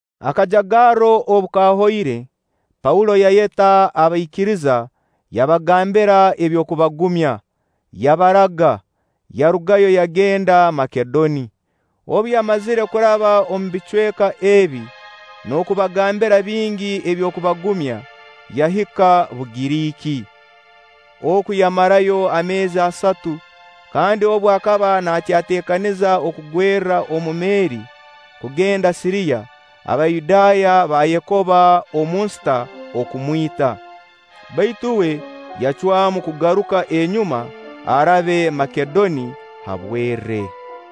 Akajagarro obu kahoire, Paulo yayeta abaikiriza yabagambira eby'okubagumya, yabaraga, yarugayo yagenda Makedoni. Obu yamazire kuraba omu bicweka ebi, n'okubagambira bingi eby'okubagumya, yahika Bugiriiki. Oku yamarayo ameezi asatu, kandi obu akaba naayeteekaniza okugwerra omu meeri kugenda Siriya, Abayudaaya baayekoba omu nsita okumwita. Baitu uwe yacwamu kugaruka enyuma arabe Makedoni ha bwerre.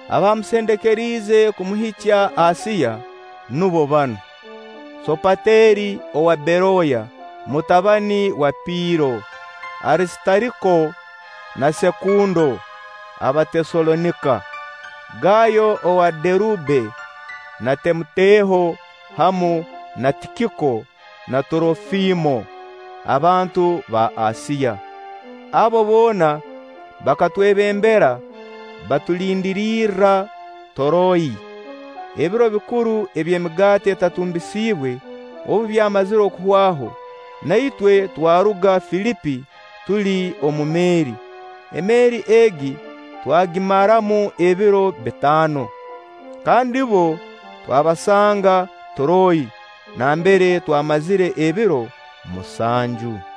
Abaamusendekeriize kumuhikya Asiya nubo banu: Soopateri owa Beroya, mutabani wa Piiro; Arisitariko na Sekundo Abateesalonika; Gaayo owa Derube na Timoteho, hamu na Tikiko na Turofimo abantu ba Asiya. Abo boona bakatwebembera, baatulindirirra Turoyi. Ebiro bikuru eby'Emigaati Etatumbisiibwe obu byamazire kuhwaho, na itwe twaruga Filipi tuli omu meeri. Emeeri egi twagimaramu ebiro bitaano, kandi bbo twabasanga Turoyi nambere twamazire ebiro musanju.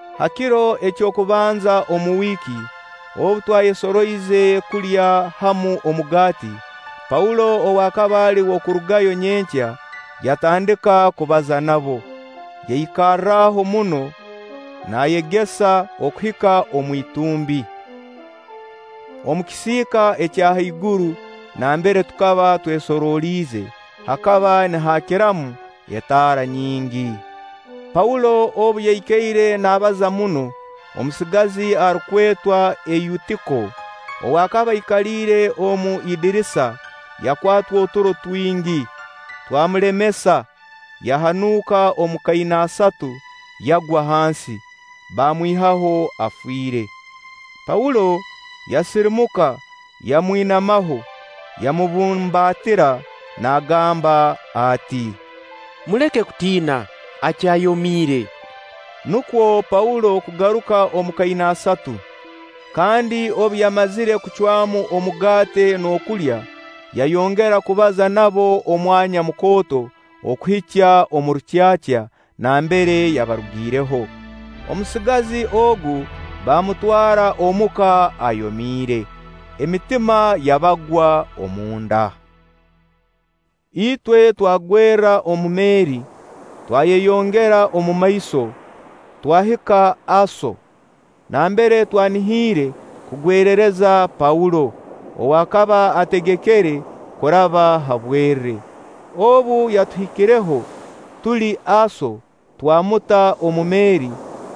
Ha kiro eky'okubanza omu wiiki, obu twayesoroize kulya hamu omugaati; Paulo, ow'akaba ali w'okurugayo nyenkya, yatandika kubaza nabo. Yaikaraho muno nayegesa okuhika omu itumbi. Omu kisiika ekya haiguru nambere tukaba twesorooliize, hakaba nihaakiramu etaara nyingi. Paulo obu yaikaire naabaza muno, omusigazi arukwetwa Eyutiko, ow'akaba aikaliire omu idirisa, yakwatwa oturo twingi, twamulemesa, yahanuuka omu kainaasatu, yagwa hansi. Baamwihaho afiire. Paulo yasirimuka, yamwinamaho, yamubumbaatira naagamba ati: “Muleke kutiina, akyayomiire.” Nukwo Paulo kugaruka omu kainaasatu, kandi obu yamazire kucwamu omugaati n'okulya, yayongera kubaza nabo omwanya mukooto okuhikya omu rukyakya nambere yabarugireho. Omusigazi ogu bamutwara omuka ayomiire, emitima yabagwa omunda. Itwe tukagwerra omu meeri, twayeyongera omumaiso, twahika Aso nambere twanihiire kugwerereza Paulo ow'akaba ategekere kuraba ha bwerre. Obu yatuhikireho tuli Aso, twamuta omu meeri,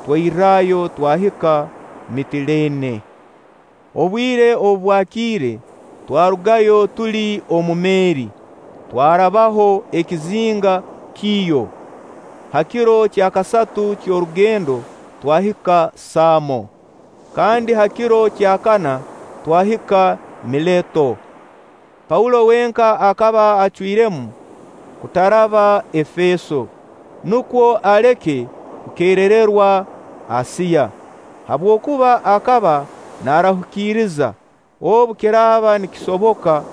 twairrayo twahika Mitileene. Obwire obu bwakiire, twarugayo tuli omu meeri, twarabaho ekizinga Kiiyo. Ha kiro kya kasatu ky'orugendo twahika Saamo, kandi ha kiro kya kana twahika Mileeto. Paulo wenka akaba acwiremu kutaraba Efeeso, nukwo aleke kukerererwa Asiya; habwokuba akaba naarahukiriza, obu kiraaba nikisoboka,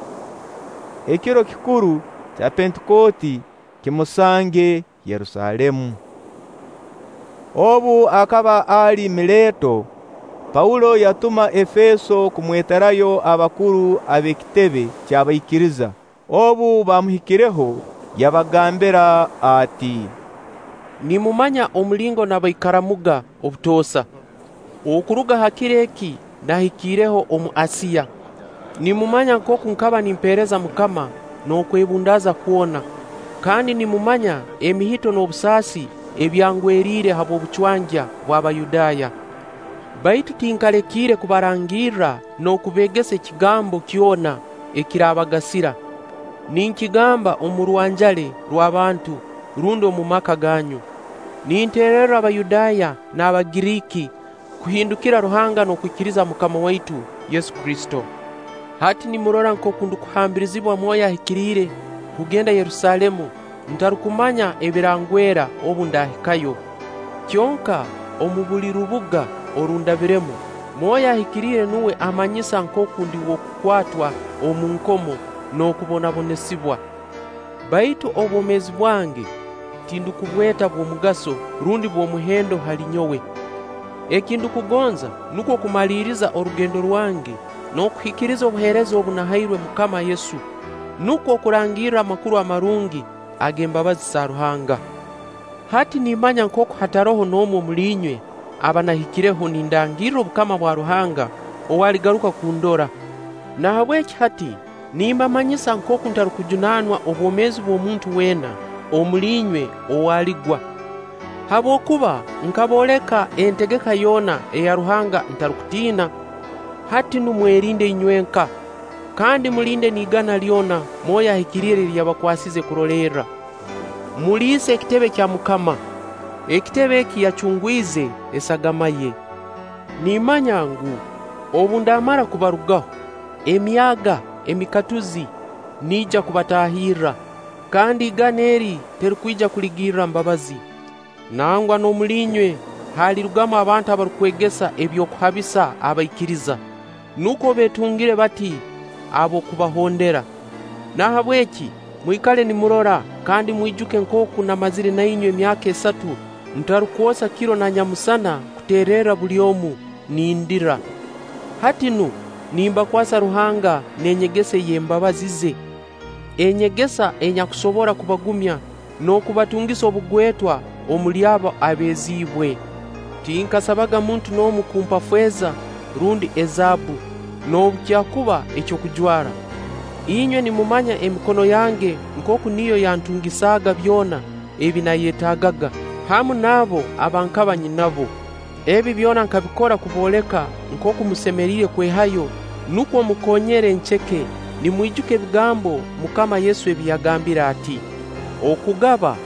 ekiro kikuru kya Pentikooti kimusange Yerusaalemu. Obu akaba ali Mileeto, Paulo yatuma Efeeso kumweterayo abakuru ab'ekitebe ky'abaikiriza. Obu baamuhikireho, yabagambira ati: “Nimumanya omulingo nabaikaramuga obutoosa, okuruga ha kiro eki naahikiireho omu Asiya. Nimumanya nkooku nkaba nimpeereza MUKAMA n'okwebundaaza kwona, kandi nimumanya emihito n'obusaasi ebyangweriire habw'obucwangya bw'Abayudaaya. Baitu tinkalekiire kubarangirra n'okubeegesa ekigambo kyona ekiraabagasira, ninkigamba omu rwanjale rw'abantu rundi omu maka ganyu, ninteererra Abayudaaya n'Abagiriiki kuhindukira Ruhanga n'okwikiriza MUKAMA waitu Yesu Kristo. Hati nimurora nkooku ndukuhambirizibwa Mwoyo Ahikiriire kugenda Yerusaalemu ntarukumanya ebirangwera obu ndaahikayo; kyonka omu buli rubuga oru ndabiremu, Mwoyo Ahikiriire nuwe ammanyisa nkooku ndi w'okukwatwa omu nkomo n'okubonabonesibwa. Baitu obwomeezi bwange tindukubweta bw'omugaso rundi bw'omuhendo hali nyowe. Eki ndukugonza nukwo kumaliiriza orugendo rwange n'okuhikiriza obuheereza obu nahairwe MUKAMA Yesu, nukwo okurangirra Amakuru Amarungi ag'embabazi za Ruhanga. “Hati nimmanya nkooku hataroho n'omu omuli inywe aba nahikireho nindangirra obukama bwa Ruhanga ow'aligaruka kundora. Nahabweki hati nimbamanyisa nkooku ntarukujunaanwa obwomeezi bw'omuntu weena omuli inywe ow'aligwa, habwokuba nkabooleka entegeka yoona eya Ruhanga ntarukutiina. Hati nu mwerinde inywenka, kandi mulinde n'igana lyona Mwoyo Ahikiriire eri yabakwasize kurolerra, muliise ekitebe kya MUKAMA. Ekitebe eki yacungwize esagama ye. Nimmanya ngu, obu ndaamara kubarugaho, emyaaga emikatuzi niija kubataahirra, kandi igana eri terukwija kuligirra mbabazi. Nangwa n'omuli inywe halirugamu abantu abarukwegesa eby'okuhabisa abaikiriza, nukwo beetungire bati ab'okubahondera. Nahabweki mwikale nimurora kandi mwijuke nkooku namazire na inywe emyaka esatu ntarukwosa kiro na nyamusana kuteererra buli omu, nindira. Hati nu, nimbakwasa Ruhanga n'enyegesa ey'embabazi ze. Enyegesa enyakusobora kubagumya n'okubatungisa obugwetwa omuli abo abeeziibwe. Tinkasabaga muntu n'omu kumpa feeza rundi ezaabbu, noobu kyakuba ekyokujwara. Inywena nimumanya emikono yange nkooku niyo yantungisaaga byona ebi naayetagaaga, hamu n'abo aba nkaba nyinabo. Ebi byona nkabikora kubooleka nkooku musemeriire kwehayo nukwo mukonyere enceke, nimwijuka ebigambo MUKAMA Yesu ebi yagambire ati: ‘Okugaba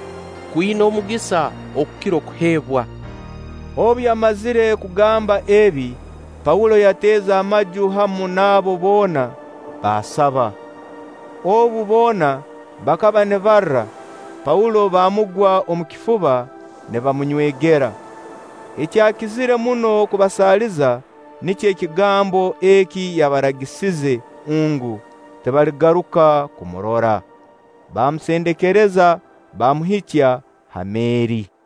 kwina omugisa okukira okuheebwa!’” Obu yamazire kugamba ebi, Paulo yateeza amaju hamu nabo boona, baasaba. Obu, boona bakaba nibarra, Paulo bamugwa omu kifuba nibamunywegera. Ekyakizire muno kubasaaliza nikyo ekigambo eki yabaragisize ngu, tibaligaruka kumurora. Baamusendekereza, baamuhikya ha meeri.